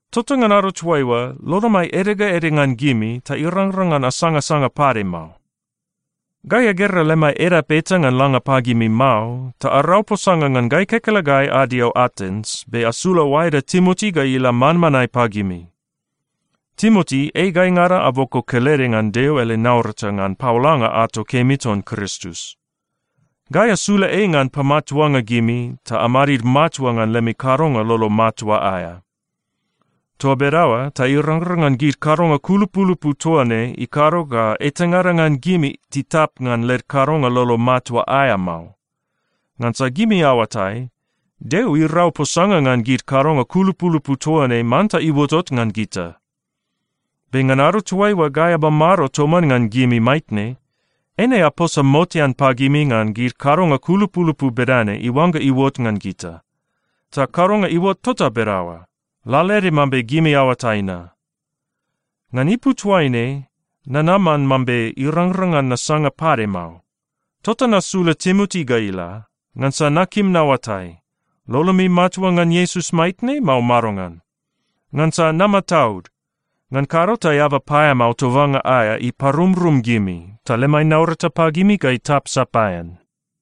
Tota ngan ado toaiua, lolomai ede ga ede ngan gimi ta irangrang ngan asangasanga pade mao. Gai agera lemai edap eta ngan langa pagimi mao, ta arau posanga ngan gai kekelegai adio Atens, be asula oaeda Timoti ga ila manmanae pagimi. Timoti ei gaingada aboko kelede ngan Deo ele naurata ngan paolanga ato kemi ton Kristus. Gai asula ei ngan pamatuanga gimi ta amadid matua ngan lemi kadonga lolo matua aea. Toa bedaoa ta irangrang ngan gid kadonga kulupulupu toa ne ikado ga etangada ngan gimi titap ngan led kadonga lolo matua aea mao. Ngansa gimi aoatai, Deo irau posanga ngan gid kadonga kulupulupu toa ne manta iuotot ngan gita. Be ngan ado toaiua gai amamado toman ngan gimi maitne, eine aposa motean pagimi ngan gid kadonga kulupulupu bedane iuangga iuot ngan gita. Ta kadonga iuot tota bedaoa, lalaede mambe gimi aoatai na. Ngan ipu toaine nanaman mambe irangrang ngan nasanga pade mao. Tota nasula Timoti ga ila, ngansa nakim naoatai, lolomi matua ngan Iesus maitne, mao madongan? Ngansa namataud. Ngan kado ta eaba paeamao tobanga aea iparumrum gimi, ta lemai naurata pagimi ga itap sapaean.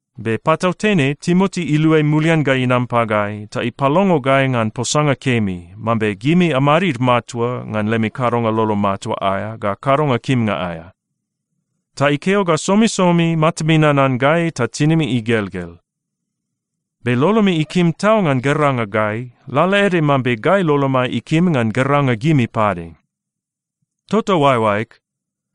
Be patautene Timoti iluai mulian ga inam pagai ta ipalongo gai ngan posanga kemi, mambe gimi amadid matua ngan lemi kadonga lolo matua aea ga kadonga kimnga aea. Ta ikeo ga somisomi matami nanan gai ta tinimi igelgel. Be lolomi ikim tau ngan geranga gai, lalaede mambe gai lolomai ikim ngan geranga gimi pade. Tota oaeoaeg,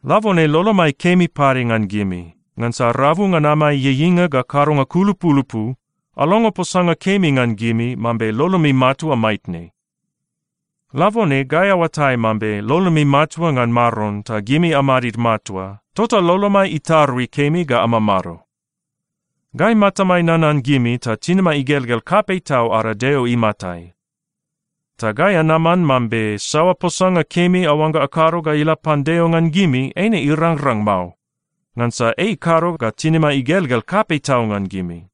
labone lolomai kemi pade ngan gimi, ngansa rabu ngan amai ieieinga ga kadonga kulupulupu, alongo posanga kemi ngan gimi mambe lolomi matua maitne. Labone gai aoatai mambe lolomi matua ngan Maron ta gimi amadid matua, tota lolomai itarui kemi ga amamado. Gai matamai nanan gimi ta tinimai igelgel kapei tau ada Deo imatai. Ta gai anaman mambe saoa posanga kemi aoangga akado ga ila pan Deo ngan gimi, eine irangrang mao, ngansa ei ikado ga tinimai igelgel kapei tau ngan gimi.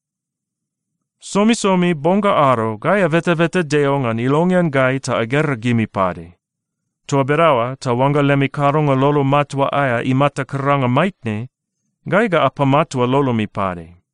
Somisomi bong ga ado, gai abetabeta Deo ngan ilongean gai ta agera gimi pade. Toa bedaoa ta oangga lemi kadonga lolo matua aea imata karanga maitne, gai ga apamatua lolomi pade.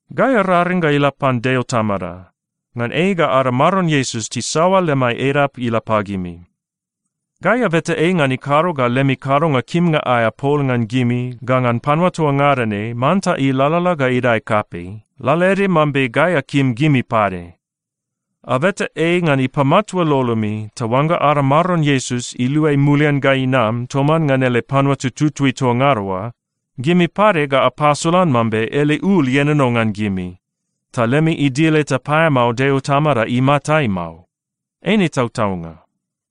Gai araring ga ila pan Deo Tamada, ngan ei ga ada Maron Iesus tisaoa lemai edap ila pagimi. Gai abeta ei ngan ikado ga lemi kadonga kimnga aea pol ngan gimi ga ngan panua toa ngada ne manta ilalala ga idae kapei, lalaede mambe gai akim gimi pade. Abeta ei ngan ipamatua lolomi, ta oangga ada Maron Iesus iluai mulian ga inam toman ngan ele panua tututui toa ngada oa, gimi pade ga apasolan mambe ele ul ienono ngan gimi, ta lemi idil eta paeamao Deo Tamada imatai mao. Eine tautaunga.